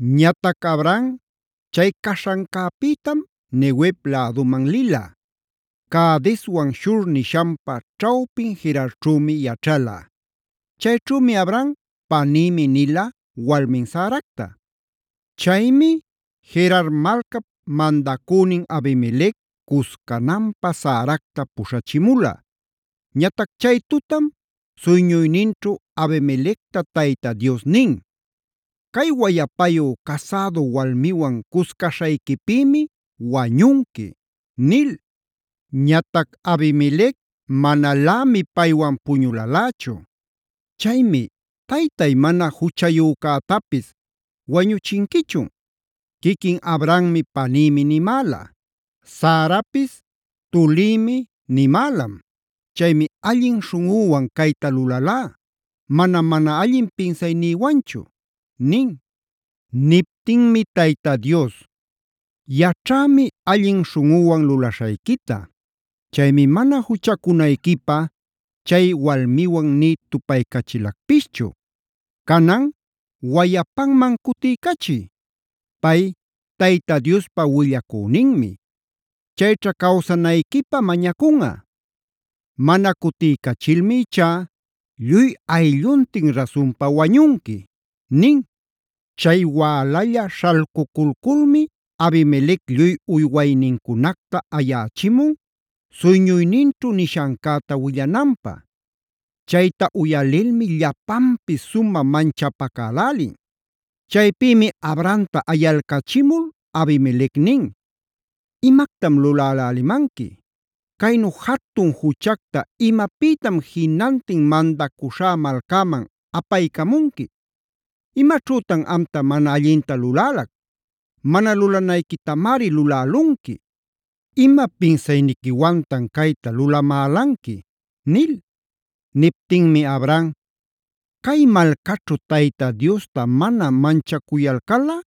Ñatac Abraham chay caśhancäpïtam Neguev läduman lila. Cadeswan Shur nishanpa ćhawpin Gerarćhümi yaćhala. Chayćhümi Abraham “panïmi”a nila walmin Saracta. Chaymi Gerar malcap mandacünin Abimelec cuscananpä Saracta puśhachimula. Ñatac chay tutam suyñuyninćhu Abimelecta Tayta Dios nin: “Cay wayapayu casädu walmiwan cuscaśhayquipïmi wañunqui” nil. Ñatac Abimelec manalämi paywan puñulalächu. Chaymi: “¿Taytay, mana juchacuyäcätapis wañuchinquichun? Quiquin Abrahammi ‘panïmi’ nimäla; Sarapis ‘tulïmi’ nimälam. Chaymi allin śhunꞌüwan cayta lulalá. Manam mana allin pinsaynïwanchu” nin. Niptinmi Tayta Dios: “Yaćhämi allin śhunꞌuwan lulaśhayquita. Chaymi mana juchacunayquipä chay walmiwan nï tupaycachilacpischu. Canan wayapanman cutiycachiy. Pay, Tayta Diospa willacüninmi; chayćha cawsanayquipä mañacunꞌa. Mana cutiycachilmi ichá lluy aylluntin rasunpa wañunqui” nin. Chay wälalla śhalcuculculmi Abimelec lluy uywaynincunacta ayächimun, suyñuyninćhu nishancäta willananpä. Chayta uyalilmi llapanpis sumä manchapacälälin. Chaypïmi Abrahamta ayalcachimul Abimelec nin: “¿¡Imactam lulälälimanqui!? ¿Caynu jatun juchacta imapïtam jinantin mandacuśhá malcäman apaycamunqui? ¿Imaćhütan amta mana allinta lulälac? Mana lulanayquitamari lulälunqui. ¿Ima pinsayniquiwantan cayta lulamälanqui?” nil. Niptinmi Abraham: “ ‘Cay malcaćhu Tayta Diosta mana manchacuyalcalꞌa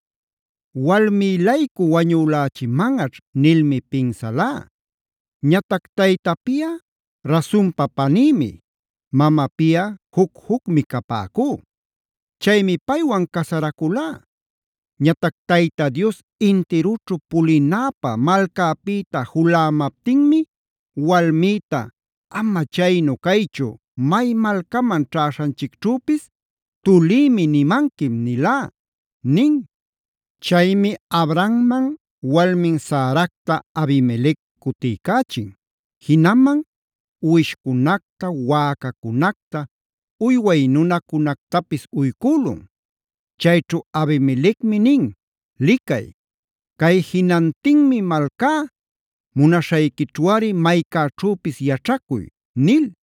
walmï-laycu wañülächimanꞌaćh’ nilmi pinsalá. Ñatac taytapiꞌa rasunpa panïmi; mamapiꞌa juc-jucmi capäcú. Chaymi paywan casaraculá. Ñatac Tayta Dios intirućhu pulinäpä malcäpïta julämaptinmi walmïta: ‘Ama chaynu caychu may malcaman ćhäśhanchicćhüpis “tulïmi” nimanquim’ nilá” nin. Chaymi Abrahamman walmin Saracta Abimelec cutiycächin, jinaman uwishcunacta, wäcacunacta, uyway nunacunactapis uycülun. Chayćhu Abimelecmi nin: “Licay, cay jinantinmi malcá; munaśhayquićhuꞌari maycäćhüpis yaćhacuy” nil.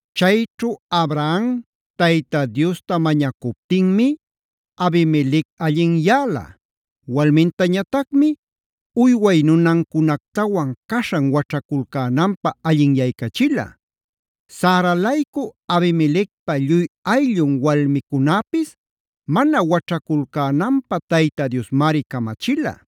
Chayćhu Abraham Tayta Diosta mañacuptinmi Abimelec allinyäla, walmintañatacmi uyway nunancunactawan caśhan waćhaculcänanpä allinyaycachila. Sara-laycu Abimelecpa lluy ayllun walmicunäpis mana waćhaculcänanpä Tayta Diosmari camachila.